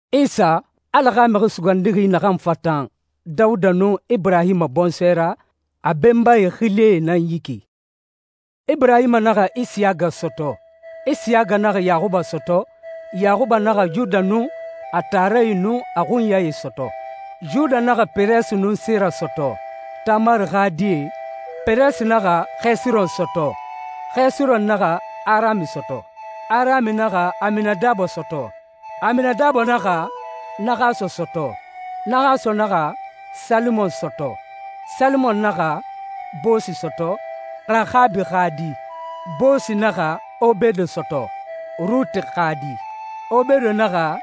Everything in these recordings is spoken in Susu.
Isa, Ala xa Mixi Sugandixi naxan fatan Dawuda nun Iburahima bɔnsɔɛ ra, a benbae xilie nan yi ki: Iburahima naxa Isiyaga sɔtɔ. Isiyaga naxa Yaxuba sɔtɔ. Yaxuba naxa Yuda nun a taarae nun a xunyae sɔtɔ. Yuda naxa Peresi nun Sera sɔtɔ, Tamari xa die. Peresi naxa Xesiron sɔtɔ. Xesiron naxa Arami sɔtɔ. Arami naxa Aminadabo sɔtɔ. Aminadabo naxa Naxason sɔtɔ. Naxason naxa Salimon sɔtɔ. Salimon naxa Boosu sɔtɔ, Raxabi xa di. Boosu naxa Obedo sɔtɔ, Ruti xa di. Obedo naxa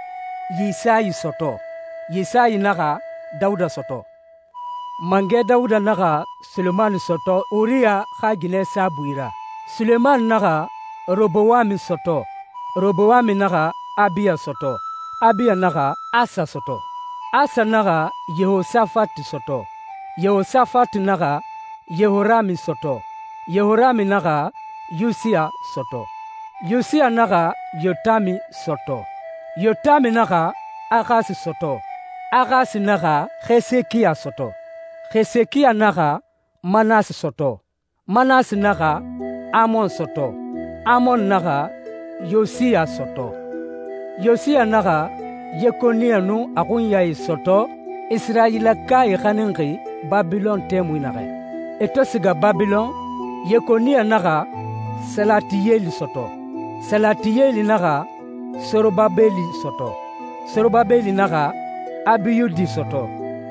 Yisayi sɔtɔ. Yisayi naxa Dawuda sɔtɔ. Mangɛ Dawuda naxa Sulemani sɔtɔ Uriya xa ginɛ saabui ra. Sulemani naxa Robowami sɔtɔ. Robowami naxa Abiya sɔtɔ. Abiya naxa Asa sɔtɔ. Asa naxa Yehosafati sɔtɔ. Yehosafati naxa Yehorami sɔtɔ. Yehorami naxa Yusiya sɔtɔ. Yusiya naxa Yotami sɔtɔ. Yotami naxa Axasi sɔtɔ. Axasi naxa Xesekiya sɔtɔ. Xesekiya naxa Manasi sɔtɔ. Manasi naxa Amon sɔtɔ. Amon naxa Yosiya sɔtɔ. Yosiya naxa Yekoniya nun a xunyae sɔtɔ, Isirayilakae xaninxi Babilɔn tɛmui naxɛ. E to siga Babilɔn, Yekoniya naxa Salatiyeli sɔtɔ. Salatiyeli naxa Sorobabeli sɔtɔ. Sorobabeli naxa Abiyudi sɔtɔ.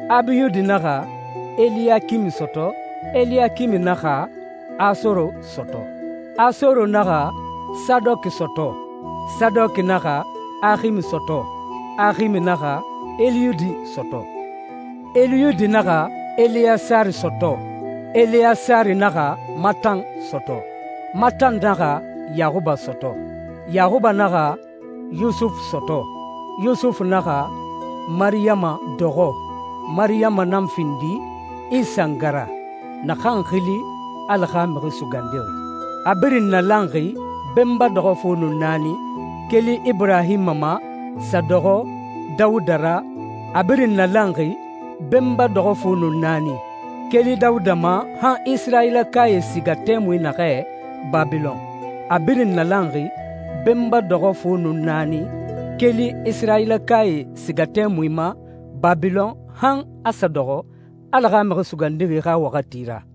Abiyudi naxa Eliyakimi sɔtɔ. Eliyakimi naxa Asoro sɔtɔ. Asoro naxa Sadɔki sɔtɔ. Sadɔki naxa Aximi sɔtɔ. Aximi naxa Eliyudi sɔtɔ. Eliyudi naxa Eleyasari sɔtɔ. Eleyasari naxa Matan sɔtɔ. Matan naxa Yaxuba sɔtɔ. Yaxuba naxa Yusufu sɔtɔ. Yusufu naxa Mariyama dɔxɔ. Mariyama nan findi Isa nga ra, naxan xili Ala xa Mixi Sugandixi. A birin nalanxi benba dɔxɔ fu nun naani, keli Iburahima ma sa dɔxɔ Dawuda ra. A birin nalanxi benba dɔxɔ fu nun naani, keli Dawuda ma, han Isirayilakae siga tɛmui naxɛ Babilɔn. A birin nalanxi benba dɔxɔ fu nun naani, keli Isirayilakae siga tɛmui ma Babilɔn, han a sa dɔxɔ Ala xa Mixi Sugandixi xa waxati ra.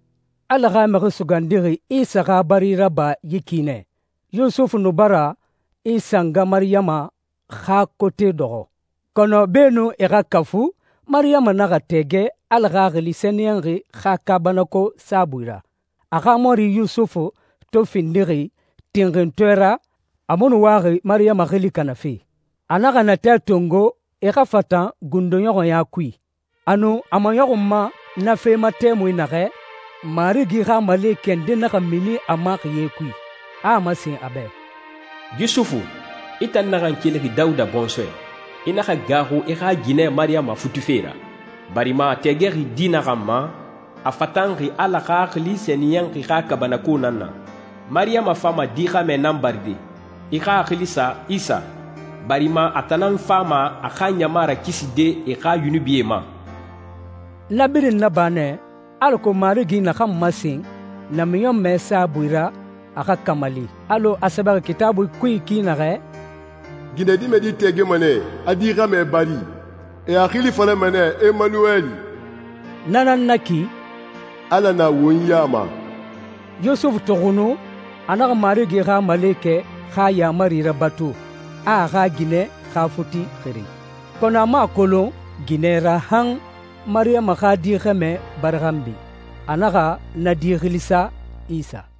Ala xa Mixi Sugandixi Isa xa bari raba yi ki nɛ: Yusufu nu bara Isa nga Mariyama xa kote dɔxɔ, kɔnɔ beenun e xa kafu, Mariyama naxa tɛɛgɛ Ala Xaxili Sɛniyɛnxi xa kaabanako saabui ra. A xa mɔri Yusufu to findixi tinxintɔɛ ra, a mu nu waxi Mariyama xili kanafe. A naxa natɛ tongo e xa fatan gundoɲɔxɔɲa kui. A nu a maɲɔxunma na fe ma tɛmui naxɛ, Marigi xa malekɛ nde naxa mini a ma xiye kui, a a masen a bɛ, «Yusufu, i tan naxan kelixi Dawuda bɔnsɔɛ, i naxa gaaxu i xa ginɛ Mariyama futife ra, barima a tɛɛgɛxi di naxan ma, a fatanxi Ala Xaxili Sɛniyɛnxi xa kaabanako nan na. Mariyama fama di xɛmɛ nan baride. I xa a xili sa Isa, barima a tan nan fama a xa ɲama rakiside e xa yunubie ma.» Na birin naba nɛ alako Marigi naxan masen namiɲɔnmɛ saabui ra, a xa kamali alɔ a sɛbɛxi Kitaabui kui ki naxɛ, «Ginɛdimɛdi tɛɛgɛma nɛ, a di xɛmɛ bari. E a xili falama nɛ Emanuwɛli.» Na nan na ki, «Ala na won ya ma.» Yusufu to xunu, a naxa Marigi xa malekɛ xa yaamari rabatu, a a xa ginɛ xa futi xiri. Kɔnɔ a mu a kolon ginɛ ra han Mariyama xa di xɛmɛ bari xanbi. A naxa na di xili sa Isa.